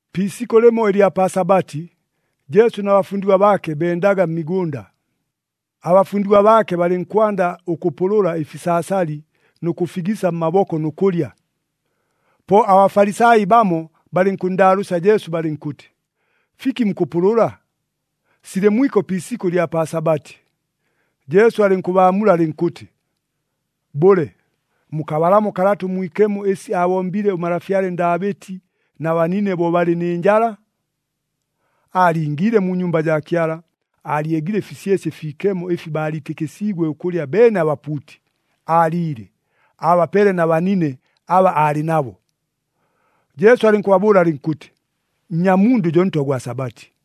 Pi isikʉ lɨmo ɨlya pa Sabati, Jesu na bafundigwa baake bendaga mmigʉnda. Abafundigwa baake balɨnkwanda ʉkʉpʉlʉla ɨfisaasali nʉ kʉfigisa mmaboko nʉ kʉlya. Po aBafalisai bamo balɨnkʉnndaalʉʉsya Jesu balɨnkʉtɨ, “Fiki mukʉpʉlʉla? Silɨ mwiko pi isikʉ ɨlya pa Sabati!” Jesu alɨnkʉbaamula alɨnkʉtɨ, “Bʉle, mukabalamo Kalata ʉMwikemo ɨsi aabombile ʉmalafyale Ndaabɨti na banine bo balɨ nɨ njala? Aalingiile mu nyumba jaa Kyala, aalyegile ɨfisyesye ɨfiikemo ɨfi baaliitɨkɨsiigwe ʉkʉlya beene abapuuti, aaliile, aabapeele na banine aba aalɨ nabo.” Jesu alɨnkʉbabʉʉla alɨnkʉtɨ, “Nnyamundʉ jo Ntwa gwa Sabati.”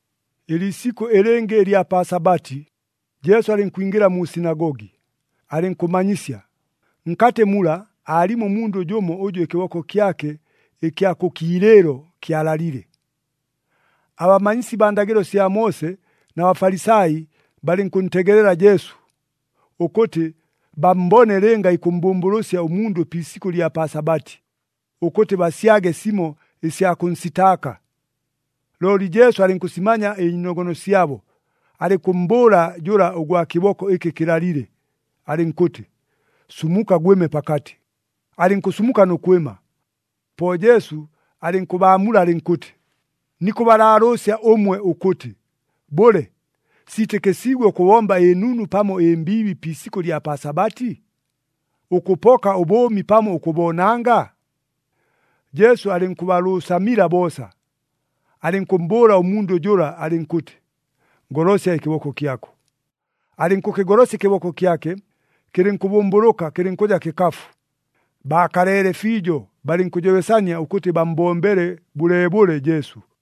Ɨliisikʉ ɨlɨngɨ ɨlya pa Sabati, Jesu alɨnkwingɨla mu sinagogi, alɨnkʉmanyisya. Nkatɨ mula, aalimo ʉmundʉ jʉmo ʉjʉ ɨkɨboko kyake ɨkya kʉ kiilɨɨlo kyalalile. Abamanyisi baa ndagɨlo sya Moose na Bafalisai balɨnkʉntegelela Jesu, ʉkʉtɨ bammbone lɨnga ikʉmmbʉmbʉlʉsya ʉmundʉ pi isikʉ ɨlya pa Sabati, ʉkʉtɨ basyage simo ɨsya kʉnsitaaka. Looli Jesu alɨnkʉsimanya ɨnyiinogono syabo, alɨnkʉmmbʉʉla jʉla ʉgwa kɨboko ɨkɨ kɨlalile, alɨnkʉtɨ, “Sumuka, gwɨme pakatɨ!” Alɨnkʉsumuka nʉ kwɨma. Po Jesu alɨnkʉbaamula alɨnkʉtɨ, “Nikʉbalaalʉʉsya ʉmwe ʉkʉtɨ, bʉle, siitɨkɨsiigwe ʉkʉbomba ɨnunu pamo ɨmbiibi pi isikʉ ɨlya pa Sabati? Ʉkʉpoka ʉbʉʉmi pamo ʉkʉboonanga?” Jesu alɨnkʉbalʉʉsamila boosa, alɨnkʉmmbʉʉla ʉmundʉ jʉla alɨnkʉtɨ, “Golosya ɨkɨboko kyako.” Alɨnkʉkɨgolosya ɨkɨboko kyake, kɨlɨnkʉbʉmbʉlʉka, kɨlɨnkʉja kɨkafu. Baakaleele fiijo, balɨnkʉjobesania ʉkʉtɨ bammbombele bʉleebʉle Jesu.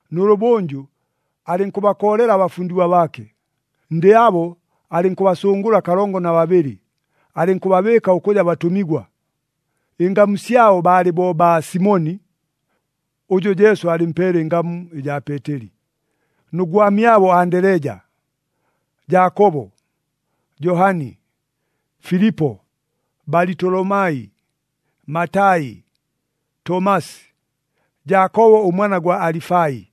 Nʉlʉbʉnjʉ, alɨnkʉbakoolela abafundigwa baake. Ndɨ abo alɨnkʉbasʉngʉla kalongo na babɨlɨ, alɨnkʉbabɨɨka ʉkʉja batʉmigwa. Ɨngamu syabo baalɨ bo baa Simoni (ʉjʉ Jesu aalɨmpeele ɨngamu ɨjaa Peeteli) nʉ gwamyabo Andeleja, Jaakobo, Johani, Filipo, Balitolomai, Matai, Tomasi, Jaakobo ʉmwana gwa Alifai,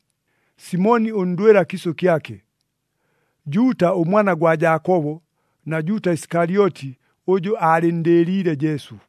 Simoni ʉndwɨla kiisʉ kyake, Juuta ʉmwana gwa Jaakobo, na Juuta Isikalyoti ʉjʉ aalɨnndɨɨliile Jesu.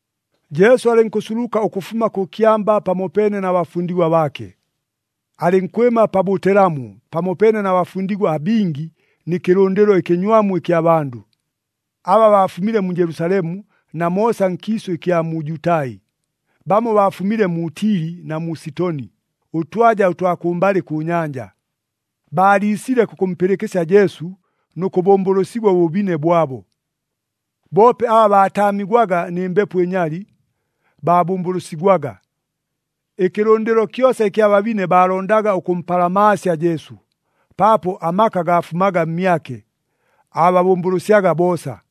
Jesu alɨnkʉsuluka ʉkʉfuma kʉ kyamba pamopeene na bafundigwa baake. Alɨnkwɨma pa bʉtelamu pamopeene na bafundigwa abingi nɨ kɨlʉndɨlo ɨkɨnywamu ɨkya bandʉ, aba baafumile mu Jelusalemu na moosa nkiisʉ ɨkya mu Jutai. Bamo baafumile mu Tili na mu Sitoni, ʉtwaja ʉtwa kʉmbalɨ kʉ nyanja. Baaliisile kʉkʉmpɨlɨkɨsya Jesu nʉ kʉbʉmbʉlʉsigwa ʉbʉbine bwabo. Boope aba baataamigwaga nɨ mbepo ɨnyali, baabʉmbʉlʉsigwaga. Ɨkɨlʉndɨlo kyosa ɨkya babine baalondaga ʉkʉmpalamaasya Jesu, paapo amaka gaafumaga mmyake, aababʉmbʉlʉsyaga boosa.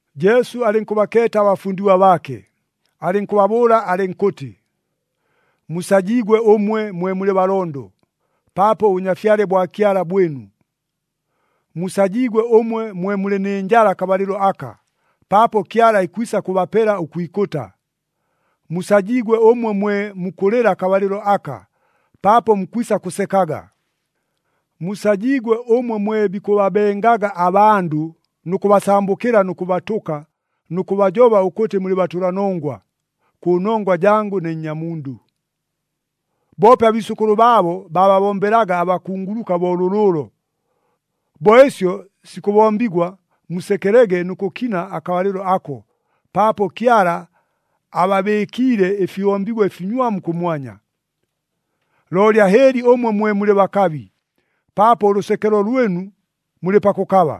Jesu alɨnkʉbakeeta abafundigwa baake, alɨnkʉbabʉʉla alɨnkʉtɨ, “Musajiigwe ʉmwe, mwe mulɨ balondo, paapo ʉBʉnyafyale bwa Kyala bwɨnu. Musajiigwe ʉmwe mwe mulɨ nɨ njala akabalɨlo aka, paapo Kyala ikwisa kʉbapela ʉkwikʉta. Musajiigwe ʉmwe mwe mukʉlɨla akabalɨlo aka, paapo mukwisa kʉsekaga. Musajiigwe ʉmwe mwe bikʉbabengaga abandʉ nʉ kʉbasambʉkɨla nʉ kʉbatʉka nʉ kʉbajoba ʉkʉtɨ mulɨ batʉlanongwa, kʉnongwa jangʉ ne Nnyamundʉ. “Boope abiisʉkʉlʉ baabo, baababombelaga abakunguluka bo lʉlʉʉlo. Bo ɨsyo sikʉbombigwa, musekelege nʉ kʉkina akabalɨlo ako, paapo Kyala ababɨɨkiile ɨfihombigwa ɨfinywamu kʉmwanya. Looli ahɨɨli ʉmwe mwe mulɨ bakabi, paapo ʉlʉsekelo lwɨnu, mulɨ pakʉkaba.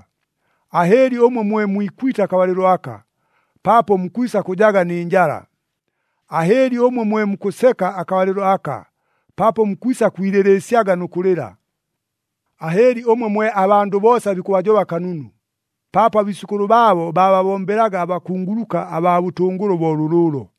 Ahɨɨli ʉmwe mwe mwikwite akabalɨlo aka, paapo mukwisa kʉjaga nɨ njala. Ahɨɨli ʉmwe mwe mukʉseka akabalɨlo aka, paapo mukwisa kwilɨlɨɨsyaga nʉ kʉlɨla. Ahɨɨli ʉmwe mwe abandʉ boosa bikʉbajoba kanunu, paapo abiisʉkʉlʉ baabo baababombelaga abakunguluka abaa bʉtʉngʉlʉ bo lʉlʉʉlo.”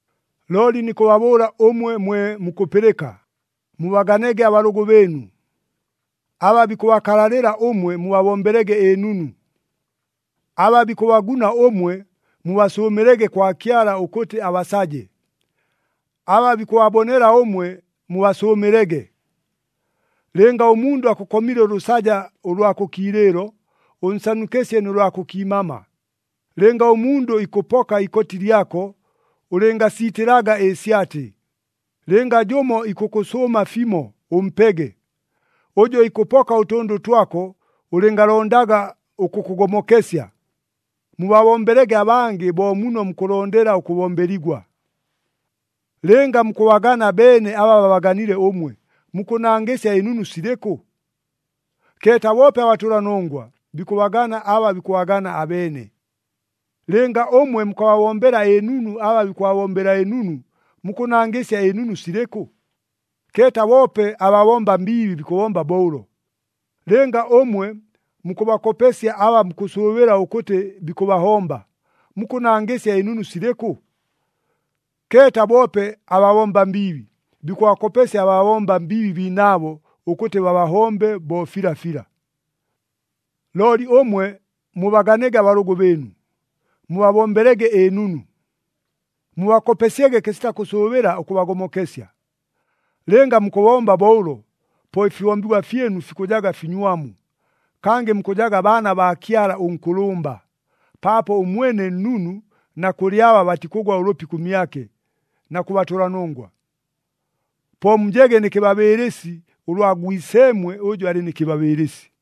“Looli nikʉbabʉʉla ʉmwe mwe mukʉpɨlɨka, mubaganege abalʉgʉ bɨɨnu. Aba bikʉbakalalɨla ʉmwe mubabombelege ɨnunu. Aba bikʉbaguna ʉmwe, mubasʉʉmɨlege kwa Kyala ʉkʉtɨ abasaje. Aba bikʉbabonela ʉmwe, mubasʉʉmɨlege. Lɨnga ʉmundʉ akʉkomile ʉlʉsaja ʉlwa kʉ kiilɨɨlo, ʉnsanukɨsye nʉ lwa kʉ kiimama. Lɨnga ʉmundʉ ikʉpoka ikoti lyako, ʉlɨngasiitɨlaga ɨsyatɨ. Lɨnga jʉmo ikʉkʉsʉʉma fimo, ʉmpege. Ʉjʉ ikʉpoka ʉtʉndʉ twako, ʉlɨngalondaga ʉkʉkʉgomokesya. Mubabombelege abangɨ bo muno mukʉlondela ʉkʉbombeligwa. “Lɨnga mukʉbagana beene aba babaganile ʉmwe, mukʉnangɨsya ɨnunu silɨkʉ? Keeta boope abatʉlanongwa, bikʉbagana aba bikʉbagana abeene. Lɨnga ʉmwe mukʉbabombela ɨnunu aba bikʉbabombela ɨnunu, mukʉnangɨsya ɨnunu silɨkʉ? Keeta boope ababomba mbiibi bikʉbomba bo ʉlo. Lɨnga ʉmwe mukʉbakopesya aba mukʉsʉʉbɨla ʉkʉtɨ bikʉbahomba, mukʉnangɨsya ɨnunu silɨkʉ? Keeta boope ababomba mbiibi, bikʉbakopesya ababomba mbiibi biinaabo ʉkʉtɨ babahombe bo filafila. “Looli ʉmwe mubaganege abalʉgʉ bɨɨnu, mubabombelege ɨnunu. Mubakopesyege kɨsita kʉsʉʉbɨla ʉkʉbagomokesya. Lɨnga mukʉbomba bo ʉlo, po ɨfihombigwa fyɨnu fikʉjaga finywamu, kangɨ mukʉjaga baana baa Kyala ʉNkʉlʉmba, paapo ʉmwene nnunu na kʉlɨ aba batikʉgwa ʉlʉpi kʉmyake, na kʉ batʉlanongwa. Po mujege nɨ kɨbabɨɨlɨsi bo ʉlwa Gwiseemwe ʉjʉ alɨ nɨ kɨbabɨɨlɨsi.”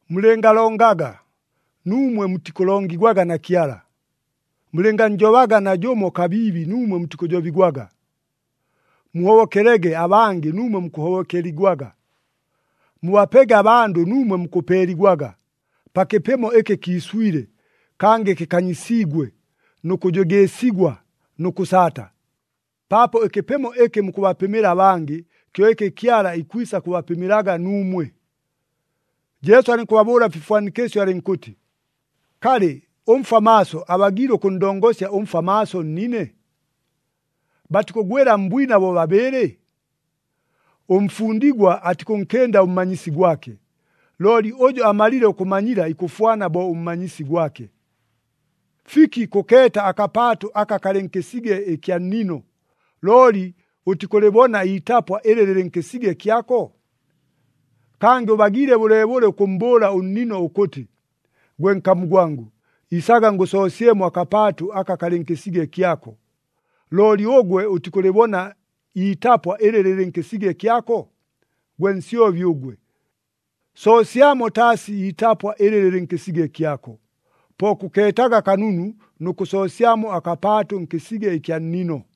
“Mulɨngalongaga, nuumwe mutikʉlongigwaga na Kyala. Mulɨngannjobaga najʉmo kabiibi nuumwe mutikʉjobigwaga. Muhobokelege abangɨ nuumwe mukʉhobokeligwaga. Mubapege abandʉ nuumwe mukʉpeeligwaga, pa kɨpɨmo ɨkɨ kiiswile, kangɨ kɨkanyisiigwe nʉ kʉjʉgɨɨsigwa nʉ kʉsaata. Paapo ɨkɨpɨmo ɨkɨ mukʉbapɨmɨla abangɨ, kyo ɨkɨ Kyala ikwisa kʉbapɨmɨlaga nuumwe.” Jesu alɨnkʉbabʉʉla mfifwanikɨsyo alɨnkʉtɨ, “Kalɨ, ʉmfwa maaso abagiile ʉkʉnndongosya ʉmfwa maaso nnine? Batikʉgwɨla mbwina bobabɨɨlɨ? Ʉmfundigwa atikʉnkɨnda ʉmmanyisi gwake, looli ʉjʉ amalile ʉkʉmanyila ikʉfwana bo ʉmmanyisi gwake. “Fiki kʉkeeta akapaatʉ aka kalɨ nkɨsige ɨkya nnino, looli ʉtikʉlɨbona iitapwa ɨlɨ lɨlɨ nkɨsige kyako? Kangɨ ʉbagiile bʉleebʉle ʉkʉmmbʉʉla ʉnnino ʉkʉtɨ, ‘Gwe nkamu gwangʉ, isaga ngʉsoosyemo akapaatʉ aka kalɨ nkɨsige kyako,’ looli ʉgwe ʉtikʉlɨbona iitapwa ɨlɨ lɨlɨ nkɨsige kyako? Gwe nsyobi ʉgwe! Soosyamo taasi iitapwa ɨlɨ lɨlɨ nkɨsige kyako, po kʉkeetaga kanunu nʉ kʉsoosyamo akapaatʉ nkɨsige ɨkya nnino!”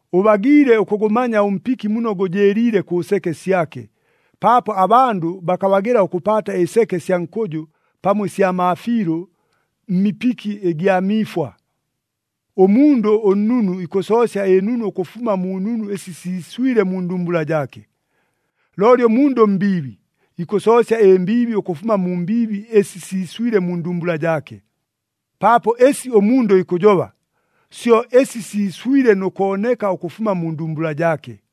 Ʉbagiile ʉkʉgʉmanya ʉmpiki muno gʉjɨɨliile kʉ seke syake, paapo abandʉ bakabagɨla ʉkʉpaata ɨseke sya nkʉjʉ pamo ɨsya maafiilʉ mmipiki ɨgya miifwa. Ʉmundʉ ʉnnunu ikʉsoosya ɨnunu ʉkʉfuma mu nunu ɨsi siiswile mu ndumbula jaake. Looli ʉmundʉ ʉmbiibi, ikʉsoosya ɨmbiibi ʉkʉfuma mu mbiibi ɨsi siiswile mu ndumbula jaake. Paapo ɨsi ʉmundʉ ikʉjoba, syo ɨsi siiswile nʉ kooneka ʉkʉfuma mu ndumbula jaake.”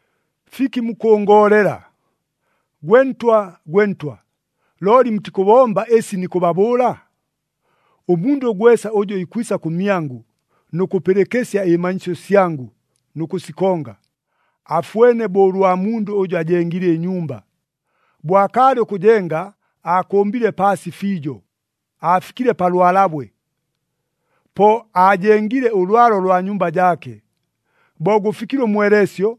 “Fiki mukʉngoolela, ‘Gwe Ntwa, gwe Ntwa,’ looli mutikʉbomba ɨsi nikʉbabʉʉla? Ʉmundʉ gwesa ʉjʉ ikwisa kʉmyangʉ, nʉ kʉpɨlɨkɨsya ɨmanyisyo syangʉ nʉ kʉsikonga, afwene bo ʉlwa mundʉ ʉjʉ ajengile ɨnyumba. Bo akaalɨ ʉkʉjenga aakʉmbile paasi fiijo, aafikile pa lwalabwe, po aajengile ʉlwalo lwa nyumba jaake. Bo gʉfikile ʉmweleesyo,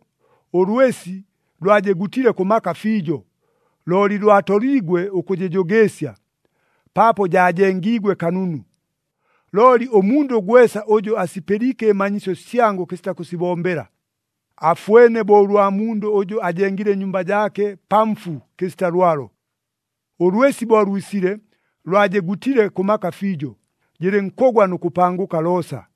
ʉlwɨsi lwajɨgutile kʉ maka fiijo, looli lwatoliigwe ʉkʉjɨjʉgɨɨsya, paapo jaajengiigwe kanunu. Looli ʉmundʉ gwesa ʉjʉ asipɨliike ɨmanyisyo syangʉ kɨsita kʉsibombela, afwene bo ʉlwa mundʉ ʉjʉ aajengile ɨnyumba jaake pa mfu kɨsita lwalo. Ʉlwɨsi bo lwisile lwajɨgutile kʉ maka fiijo, jɨlɨnkʉgwa nʉ kʉpangʉka joosa.”